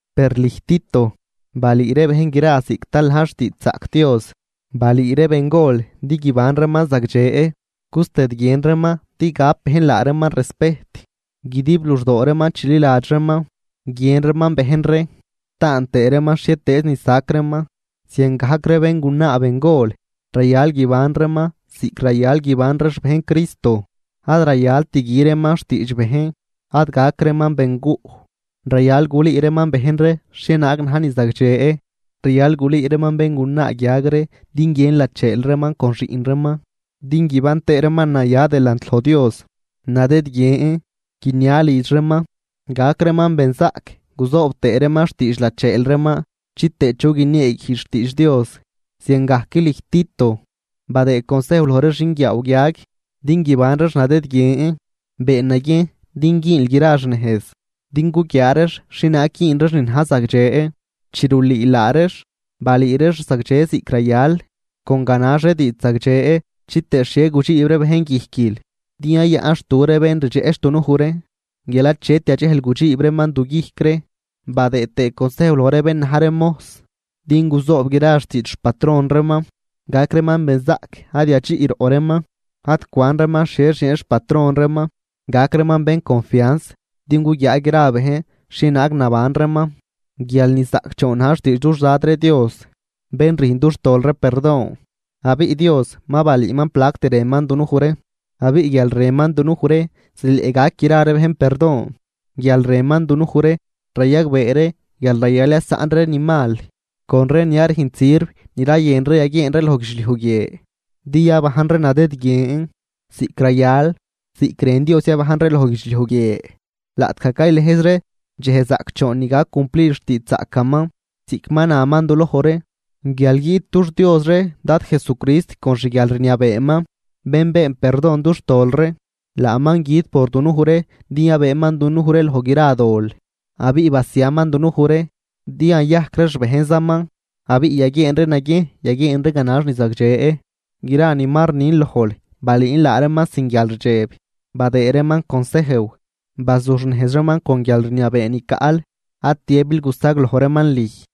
Per lüj Tito, balüü ree bejn gra ziꞌc tal na̱j xtiidxzaꞌc Dios. Balüü ree bengol din guiban reeman zagdxe, gustëdguien reeman din gap bejn laa reeman respejt, guidib luxdoo reeman chililadx reeman, guiën reeman bejn ree, taan tëë reeman xhietëëz ni sac reeman. Ziangajc ree béngunaa bengol rayal guiban reeman ziꞌc rayal guiban ree xbejn Cristo. Ad rayalt gü reeman xtiidx bejn, ad gac reeman benguꞌ. Rayal gulüü reeman bejn ree xhienaag na̱j ni zagdxe, rayal gulüü reeman béngunaa guiag ree din guiën lacheel reeman con xiꞌn reeman, din guiban tëë reeman naya delant loj Dios, nadëdguien, guinia lidx reeman, gac reeman benzaꞌc guzoob tëë reeman xtiidx lacheel reeman chitëë chu guinieeguijdx xtiidx Dios. Ziangajc lüj Tito, badëë consejw loj ree xinguiaaw guiag din guiban reex nadëdguien. Been naguiejn din güünl gra xnejz din guguiaa reex xhienaag güün reex ni na̱j zagdxe. Chi rulüül laa reex, balüü reex zagdxe ziꞌc rayal, con ganax ree diidx zagdxe chitëë xhie gudxiib ree bejn guijquil, din yayaꞌnxtu ree bén ni rdxeꞌch dunuj ree guial achet yadxejl gudxiib reeman duguijc ree. Badëë tëë consejw loj ree bén na̱j ree mojs din guzoob gra xtiidx xpatron reeman, gac reeman benzaꞌc ad yadxiꞌroꞌ reeman. Ad cwan reeman xhie xieen xpatron reeman, gac reeman bén confians din guguiaa gra ree bejn xhienaag naban reeman guial nizaꞌcdxoon na̱j xtiidx dux Dad ree Dios bén rüjn dux tol ree perdon. Abiꞌ Dios ma balüüman plact rënman dunuj ree, abiꞌ guial rënman dunuj ree zileꞌ gac gra ree bejn perdon. Guial rënman dunuj ree rayagbee ree guial rayal yasaꞌn ree ni mal con ree ni ad rünjt sirv ni rayën ree yaguieen ree loj guidxliuj guie, din yabajn ree nadëdguien, ziꞌc rayal, ziꞌc rën Dios yabajn ree loj guidxliuj guie laꞌtgaj caylëjz ree dxej zaꞌcdxoon ni gac cumplid xtiidxzaꞌcaman ziꞌc ma naman duloj ree guial guiꞌt dux Dios ree Dad Jesucrist con xguialrniabeeman, bén been perdon dux tol ree. Laaman güt por dunuj ree din yabëëman dunuj ree loj gra dol abiꞌ basiaman dunuj ree din yayajc ree xbejnzaman abiꞌ yaguieen ree naguiejn yaguieen ree ganax ni zagdxe. Gra ni ma rnin lojl balüün laa reeman sin guialrdxeb badëëd reeman consejw, bazuxnejz reeman con guialrniabee ni caꞌl. Ad tiëbil gusagloj reeman lüj.